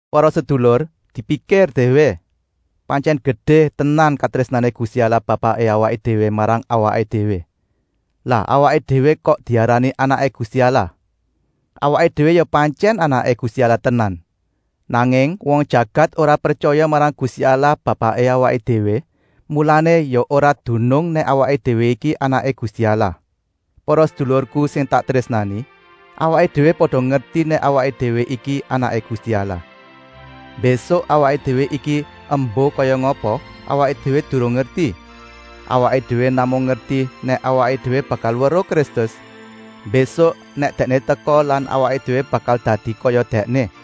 Para sedulur, dipikir déwé! Pantyèn gedé tenan katrésnané Gusti Allah Bapaké awaké déwé marang awaké déwé, lah awaké déwé kok diarani anaké Gusti Allah. Awaké déwé ya pantyèn anaké Gusti Allah tenan. Nanging wong jagat ora pretyaya marang Gusti Allah Bapaké awaké déwé, mulané ya ora dunung nèk awaké déwé iki anaké Gusti Allah. Para sedulurku sing tak trésnani, awaké déwé pada ngerti nèk awaké déwé iki anaké Gusti Allah. Mbésuk awaké déwé iki embuh kaya ngapa, awaké déwé durung ngerti. Awaké déwé namung ngerti nèk awaké déwé bakal weruh Kristus, mbésuk nèk Dèkné teka lan awaké déwé bakal dadi kaya Dèkné.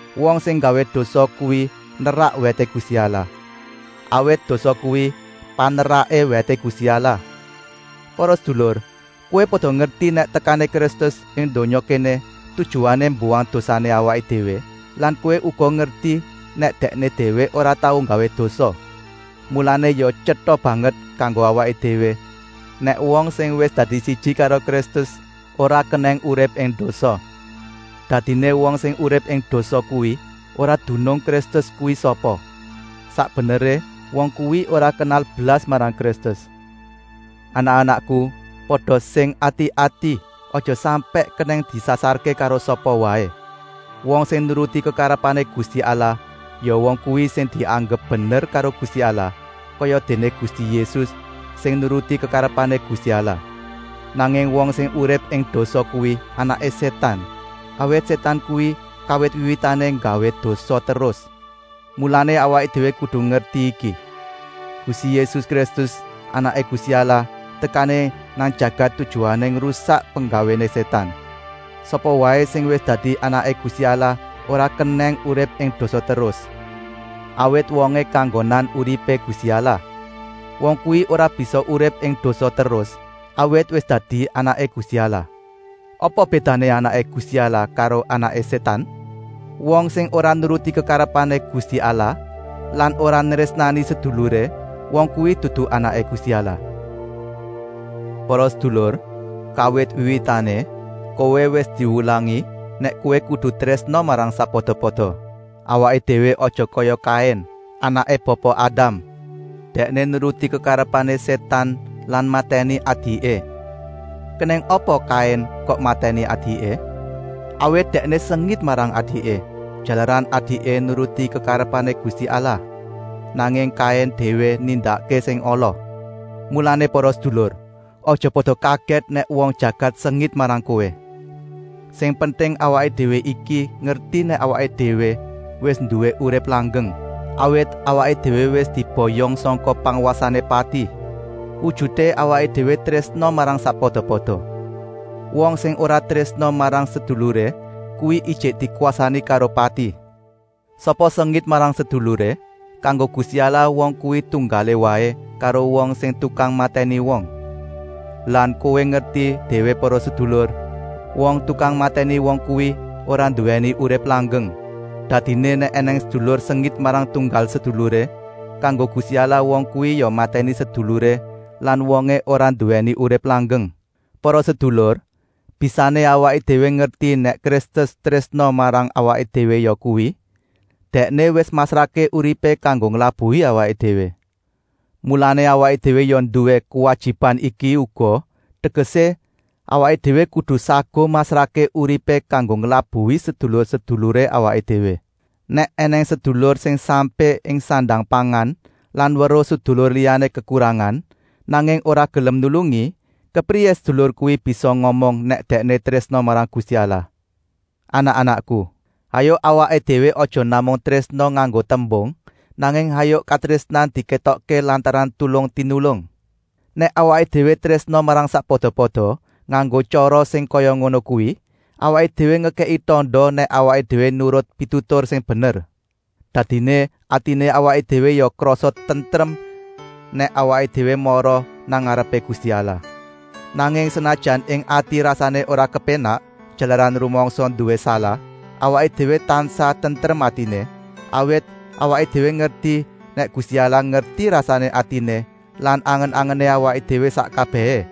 Wong sing nggawé dosa kuwi nerak wèté Gusti Allah, awit dosa kuwi paneraké wèté Gusti Allah. Para sedulur, kowé pada ngerti nèk tekané Kristus ing donya kéné tujuané mbuwang dosané awaké déwé lan kowé uga ngerti nèk Dèkné déwé ora tau nggawé dosa. Mulané ya tyeta banget kanggo awaké déwé nèk wong sing wis dadi siji karo Kristus ora kenèng urip ing dosa. Dadiné, wong sing urip ing dosa kuwi ora dunung Kristus kuwi sapa. Sak beneré wong kuwi ora kenal blas marang Kristus. Anak-anakku, pada sing ati-ati, aja sampèk kenèng disasarké karo sapa waé. Wong sing nuruti kekarepané Gusti Allah, ya wong kuwi sing dianggep bener karo Gusti Allah, kayadéné Gusti Yésus sing nuruti kekarepané Gusti Allah. Nanging wong sing urip ing dosa kuwi anaké Sétan, awit Sétan kuwi kawit wiwitané nggawé dosa terus. Mulané awaké déwé kudu ngerti iki: Gusti Yésus Kristus, Anaké Gusti Allah, tekané nang jagat tujuané ngrusak penggawéné Sétan. Sapa waé sing wis dadi anaké Gusti Allah ora kenèng urip ing dosa terus, awit wongé kanggonan uripé Gusti Allah. Wong kuwi ora bisa urip ing dosa terus, awit wis dadi anaké Gusti Allah. Apa bédané anaké Gusti Allah karo anaké Sétan? Wong sing ora nuruti kekarepané Gusti Allah lan ora nrésnani seduluré, wong kuwi dudu anaké Gusti Allah. Para sedulur, kawit wiwitané kowé wis diwulangi nèk kowé kudu trésna marang sakpada-pada. Awaké déwé aja kaya Kain, anaké Bapa Adam. Dèkné nuruti kekarepané Sétan lan matèni adiké. Kenèng apa Kain kok matèni adiké? Awit dèkné sengit marang adiké, jalaran adiké nuruti kekarepané Gusti Allah. Nanging Kain déwé nindakké sing ala. Mulané para sedulur, aja pada kagèt nèk wong jagat sengit marang kowé. Sing penting, awaké déwé iki ngerti nèk awaké déwé wis nduwé urip langgeng, awit awaké déwé wis diboyong sangka pangwasané pati. Wujuté awaké déwé trésna marang sakpada-pada. Wong sing ora trésna marang seduluré kuwi ijik dikwasani karo pati. Sapa sengit marang seduluré, kanggo Gusti Allah wong kuwi tunggalé waé karo wong sing tukang matèni wong. Lan kowé ngerti déwé para sedulur, wong tukang matèni wong kuwi ora nduwèni urip langgeng. Dadiné nèk ènèng sedulur sengit marang tunggal seduluré, kanggo Gusti Allah wong kuwi ya matèni seduluré lan wongé ora nduwèni urip langgeng. Para sedulur, bisané awaké déwé ngerti nèk Kristus trésna marang awaké déwé yakuwi, Dèkné wis masrahké uripé kanggo nglabuhi awaké déwé. Mulané awaké déwé ya nduwé kuwajiban iki uga, tegesé, awaké déwé kudu saguh masrahké uripé kanggo nglabuhi sedulur-seduluré awaké déwé. Nèk ènèng sedulur sing sampé ing sandang-pangan lan weruh sedulur liyané kekurangan, nanging ora gelem nulungi, kepriyé sedulur kuwi bisa ngomong nèk dèkné trésna marang Gusti Allah. Anak-anakku, hayuk awaké déwé aja namung trésna nganggo tembung, nanging hayuk katrésnan dikétokké lantaran tulung-tinulung. Nèk awaké déwé trésna marang sakpada-pada nganggo tyara sing kaya ngono kuwi, awaké déwé ngekèki tanda nèk awaké déwé nurut pitutur sing bener. Dadiné atiné awaké déwé ya krasa tentrem nèk awaké déwé mara nang ngarepé Gusti Allah. Nanging senajan ing ati rasané ora kepénak jalaran rumangsa nduwé salah, awaké déwé tansah tentrem atiné, awit awaké déwé ngerti nèk Gusti Allah ngerti rasané atiné lan angen-angené awaké déwé sak kabèhé,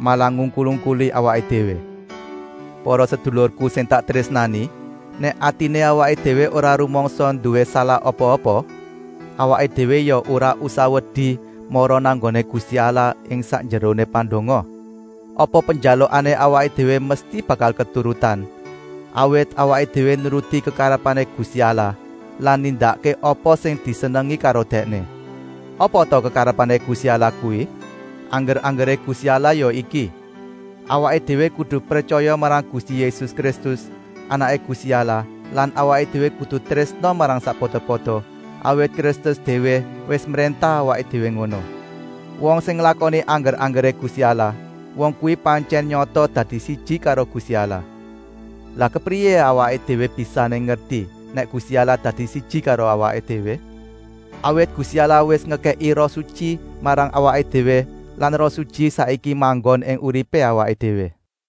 malah ngungkul-ungkuli awaké déwé. Para sedulurku sing tak trésnani, nèk atiné awaké déwé ora rumangsa nduwé salah apa-apa, awaké déwé ya ora usah wedi mara nang nggoné Gusti Allah ing sakjeroné pandonga. Apa penjalukané awaké déwé mesti bakal keturutan, awit awaké déwé nuruti kekarepané Gusti Allah lan nindakké apa sing disenengi karo Dèkné. Apa ta kekarepané Gusti Allah kuwi? Angger-anggeré Gusti Allah ya iki: awaké déwé kudu pretyaya marang Gusti Yésus Kristus, Anaké Gusti Allah lan awaké déwé kudu trésna marang sakpada-pada, awit Kristus déwé wis mréntah awaké déwé ngono. Wong sing nglakoni angger-anggeré Gusti Allah, wong kuwi pantyèn nyata dadi siji karo Gusti Allah. Lah kepriyé awaké déwé bisané ngerti nèk Gusti Allah dadi siji karo awaké déwé? Awit Gusti Allah wis ngekèki Roh Sutyi marang awaké déwé lan Roh Sutyi saiki manggon ing uripé awaké déwé.